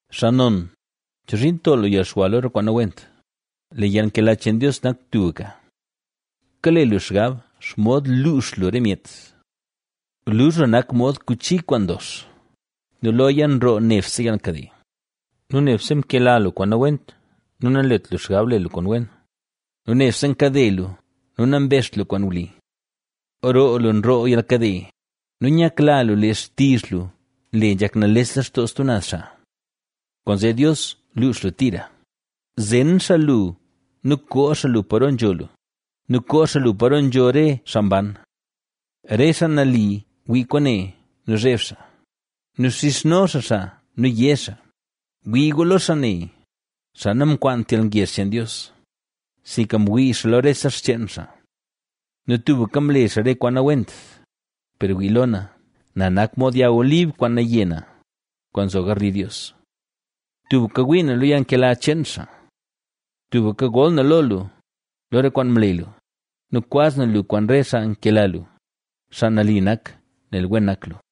Xaa non, ¿chozhiin nto lu yalxwa lo re kwaan nawent? Lee yalnkela cheen Dios nak tubka. Kale lu xgab xomod luux lu re myet. Luzh lu nak mod kuchi kwaan ndox nu loya nroo nebse yalkade, nu nebse mkela lu kwaan nawent nu nanlet lu xgab le lu kwaan wen nu nebse nkade lu nu nambezht lu kwaan wli. Roo lu nroo yalkade nu nyakla lu lee xtizh lu nle nzhak nales lextoo stub naz xaa. Kwaanzee Dios luux lu tira; zen xaa lu nu koo xaa lu paro nzho lu nu koo xaa lu paro nzho re xaa mban. Re xaa nali wii kwaane nu zheb xaa nu xizhno xaa xaa nu yé xaa: Wii gu lo xaa ne, xaa namkwaant yalngezh cheen Dios, sinka mwii xaa lo rese xcheen xaa nu tubka mle xaa re kwaan nawent. Per wii lo na, na nak mod yag olib kwaan naye na, kwaan nzo garli Dios. Tubka ngwii na lo yalnkela cheen xaa. Tubka gol na lo lu, lo re kwaan mle lu nu kwaz na lu kwaan re xaa nkela lu, xaa nali nak, nel wen nak lu.